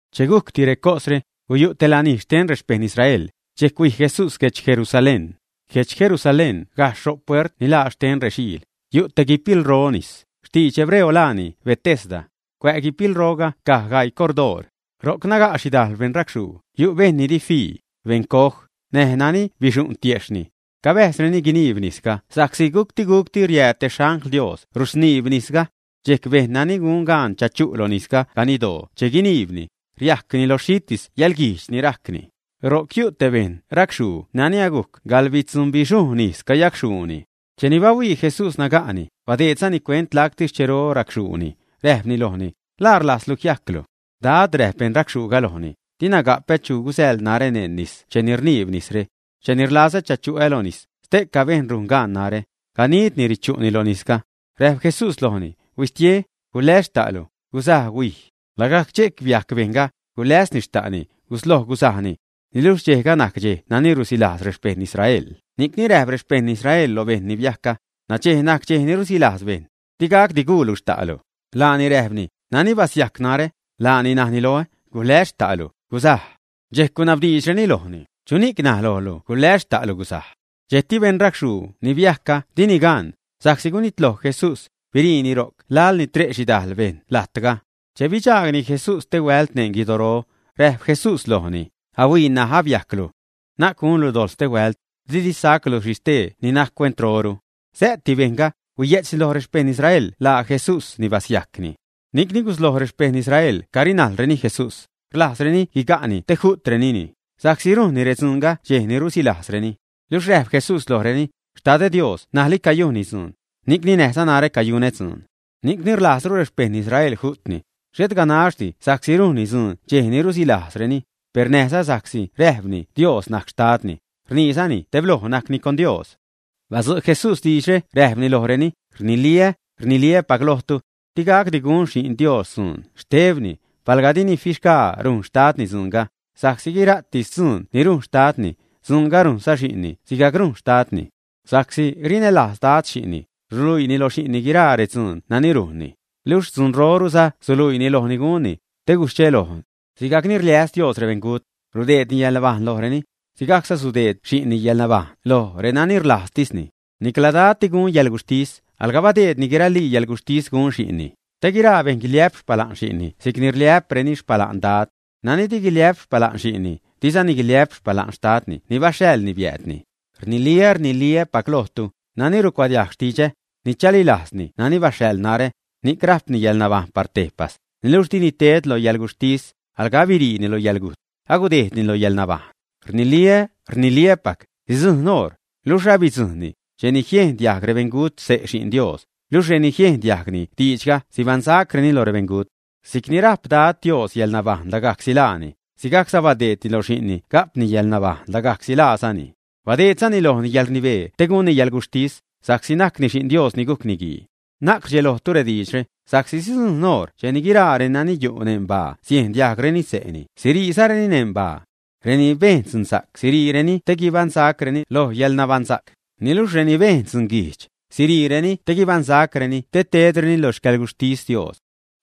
Che gujcti recosre, guyu' te lanij xten rexpejṉ Israel, dxejc huij Jesús guedx Jerusalén. Guedx Jerusalén, gajxh ro' puert ni laa xten rexiil, yu' te guipilro nis; xtidx hebreo laani Betesda. Cuä' guipilroga caj gaii cordoor. Ro'c naga' xhidajl bejṉ racxhuu, yu' bejṉ ni di fii, beṉcoj, näj bejṉ nani bixu'n tiejxhni. Cabäjzreni guiniib nisga sa'csi gucti-guc riääd te xangl Dios rusniib nisga. Dxejc bejṉ nani gun gaan chachu' lo nis ganiddoo che guiniibni, riajcni lo xhitis yäḻguijdx ni rajcni. Ro'c guyu' te beṉ racxhuu nani agujc gaḻbitzubixhujṉ ijz cayacxhuuni. Cheni bahuii Jesús naga'ni, badeedzani cuent lacti xchero raxchuuni, räjpni lojni: ―¿La rlajzlu jiajclu? ―Dad ―räjp beṉ racxhuuga lojni―, dina gapä chu gusäḻ narä neṉ nis cheni rniib nisre. Cheni rlazä chachu'ä lo nis, stee bejṉ rujn gaan narä, ganidni richu'ni lo nisga. Räjp Jesús lojni: ―Huistie, guläs xta'lu, guzaj, huij. Lagajc dxejc biajc bejṉga, guläsni xta'ni, gusloj gusajni. Niluxh dxejga najc dxej nani rusilajz rexpejṉ Israel, ni'c räjp rexpejṉ Israel lo bejṉ ni biajcga: ―Nadxej najc dxej ni rusilajz bejṉ. Di gacdi guulu xta'lu. Laani räjpni: ―Nani basiajc narä, laani naj loä: “Guläs xta'lu, gusaj.” Dxejc gunabdiidxreni lojni: ―¿Chuni'c naj lojlu “Guläs xta'lu, gusaj”? Dxejcti beṉ racxhuu ni biajcga dini gaan, sa'csi gunitloj Jesús, biriini ro'c laḻ ni tre' xhidajl bejṉ lajtga. Che bidxaagni Jesús stehuält neṉ guidoro, räjp Jesús lojni: ―Ahuii, ṉaj ni abiajclu, na'c gunlu dojḻ stehuält, didi sajclu xhi stee ni najc cuentroru. Sä'ti bejṉga, huiye'tzni loj rexpejṉ Israel laa Jesús ni basiajcni. Ni'cni gusloj rexpejṉ Israel carinajlreni Jesús, rlajzreni guiga'ni te ju'trenini, sa'csi rujnni redzuunga dxej ni rusilajzreni. Luxh räjp Jesús lojreni: ―Xtadä Dios ṉajli cayujnni dzuun, ni'cni näjza narä cayunä dzuun. Ni'cni rlajzru rexpejṉ Israel ju'tni, xhet ganaxdi sa'csi rujnni dzuun dxej ni rusilajzreni, per näjza sa'csi räjpni Dios najc Xtadni, rniizani tebloj najcni con Dios. Badzu' Jesús diidxre räjpni lojreni: ―Rniliä, rniliä́pac lojtu. Di gacdi gun Xi'n Dios dzuun xtebni, palga dini fixgaa rujn Xtadni dzuunga, sa'csi guira'tis dzuun ni rujn Xtadni, dzuunga rujnza Xi'nni sigajc rujn Xtadni. Sa'csi rinälajz Dad xi'nni, ruluiini lo xi'nni guiraa redzuun nani rujnni, luxh dzunroruza suluiini lojni gunni, te guidxelojtu. Sigajc ni rliäs Dios rebeṉgut, rudeedni yäḻnabajṉ lojreni, sigajcza sudeed xi'nni yäḻnabajṉ lo renani rlajztisni. Nicla Dad di gun yäḻguxhtis, alga badeedni guiralii yäḻguxhtis gun Xi'nni, te guiraa bejṉ guiliä'p xpala'n xi'nni si'cni rliä'preni xpala'n Dad. Nani di guiliä'p xpala'n Xi'nni, dizani guiliä'p xpala'n Xtadni ni baxhaḻni biäädni. ’Rniliä, rniliä́pac lojtu, nani rucuadiajg xtidxä, ni chalilajzzani nani baxhaḻ narä, ni'c rajpni yäḻnabajṉ par tejpas; niluxh dini ted lo yäḻguxhtis, alga abiriini lo yäḻgujt, agudejdni lo yäḻnabajṉ. Rniliä, rniliä́pac, sidzujṉ oṟ, luxh alabidzujṉni, cheni siejn diajg rebeṉgut xse' Xi'n Dios, luxh reni riejn diajgni diidxga sibaṉsacreni lo rebeṉgut. Si'cni rajp Dad Dios yäḻnabajṉ lagajcsi laani, sigajcza badeedni lo Xi'nni ga'pni yäḻnabajṉ lagajcsi laazani. Badeedzani lojni yäḻrnibee te gunni yäḻguxhtis, sa'csi najcni Xi'n Dios ni gujc Niguii. Na'c rdxelojtu rediidxre, sa'csi sidzujṉ oṟ cheni guiraa reni yu' neṉ baa siejn diajgreni xse'ni siriizareni neṉ baa. Reni bejn dzunsa'c siriireni te guibaṉsacreni loj yäḻnabaṉsa'c, niluxh reni bejn dzunguijdx, siriireni te guibaṉsacreni te tedreni lo xcäḻguxhtis Dios.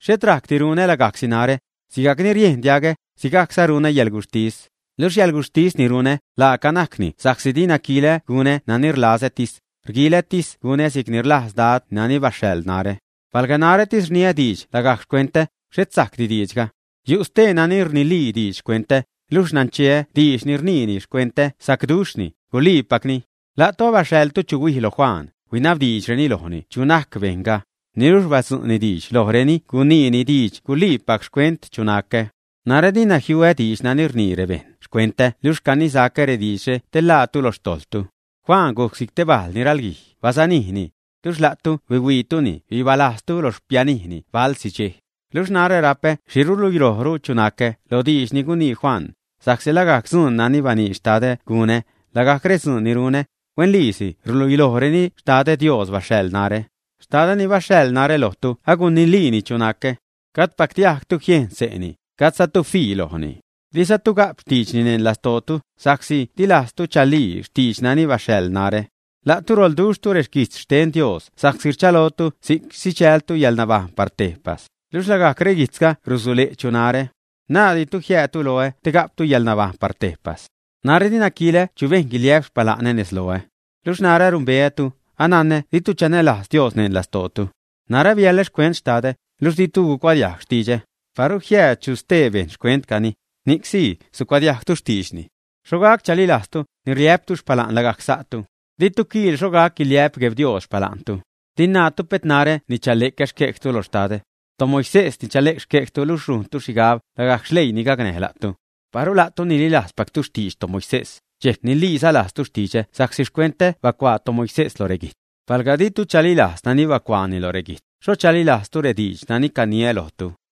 ’Xhet rajcdi runä lagajcsi narä. Sigajc ni riejn diagä, sigajcza runä yäḻguxhtis. Luxh yäḻguxhtis ni runä laaca najcni sa'csi dina quilä gunä nani rlazätis, rguilätis gunä si'c ni rlajz Dad nani baxhaḻ narä. Palga narätis rniä diidx lagajc xcuentä, xhet sajcdi diidxga. Yu' stee nani rnilii diidx xcuentä, luxh nancheä diidx ni rniini xcuentä sacduxhni, guliipacni. La'tu abaxhaḻtu chu huij loj Juan, huinabdiidxreni lojni “chu najc bejṉga”, niluxh badzu'ni diidx lojreni guniini diidx guliipac xcuent chu nacä. Narä dina jiuä diidx nani rnii rebejṉ xcuentä luxh canisacä rediidxre te ḻaatu lo xtojḻtu. Juan gujc si'c te bajl ni ralguij, basanijzani. Luxh la'tu huihuiituni bibalajztu lo xpianijni balsi dxej. Luxh narä rapä xhi ruluilojru chu nacä lo diidx ni gunii Juan; sa'csi lagajc dzuun nani baniidx Xtadä gunä, lagajc redzuun ni runä, huenliisi ruluilojreni Xtadä Dios baxhaḻ narä. Xtadä ni baxhaḻ narä lojtu agunilii chu nacä. Gajdpactu jiejn diajg xse'ni, gajdzatu fii lojni. Dizatu ga'p xtiidxni neṉ lastootu, sa'csi di lajztu chalii xtiidx nani baxhaḻ narä. La'tu roḻduxhtu reguijtz xten Dios sa'csi rchalotu si'c sidxältu yäḻnabajṉ par tejpas, luxh lagajc reguijtzga rusule' chu narä. Naadditu jiäädtu loä te ga'ptu yäḻnabajṉ par tejpas. ’Narä dina quilä chu bejṉ guiliä'p xpala'nä nez loä. Luxh narä anumbeätu, ananä ditu chanälajz Dios neṉ lastootu. Narä biälä xcuent Xtadä, luxh ditu gucuadiajg xtidxä; paru jiääd chu stee bejṉ xcuentcani, ni'c sii sucuadiajgtu xtiidxni. Xho gac chalilajztu, ni rliä'ptu xpala'n lagajc sa'tu. Ditu quiil xho gac guiliä'p Gueb Dios xpala'ntu. Di naatu pet narä ni chale'cä xquejtu lo Xtadä. ToMoisés ni chale'c xquejtu, luxh rujntu xhigab lagajc xleiini gacnäj la'tu. Paru la'tu nililajzpactu xtidx toMoisés, dxejc niliiza lajztu xtidxä sa'csi xcuentä bacuaa toMoisés lo reguijtz. Palga ditu chalilajz nani bacuaani lo reguijtz, ¿xho chalilajztu rediidx nani caniä lojtu, ä?